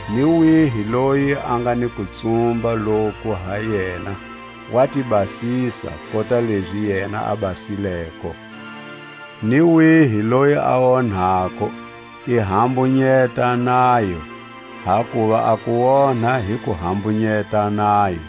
Ni wihi loyi a nga ni kutsumba loku ha yena, wa ti basisa, kota lezi yena a basileko. Ni wihi loyi a onhako i hambunyeta nayo; hakuva a kuonha hi ku hambunyeta nayo.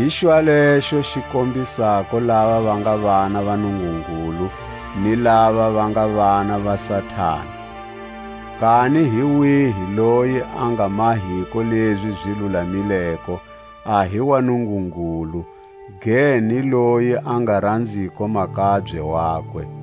Hi xwalexo xi kombisako lava va nga vana va Nungungulu ni lava va nga vana va Satani: kani hi wihi loyi a nga mahiko lezi zi lulamileko a hi wa Nungungulu, ge ni loyi a nga ranziko makabye wakwe.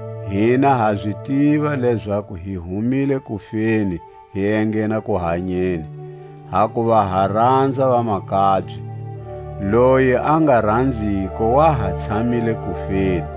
Hina ha zi tiva lezaku hi humile kufeni hi enghena kuhanyeni, hakuva ha ranza vamakabye. Loyi a nga ranziko wa ha tshamile kufeni.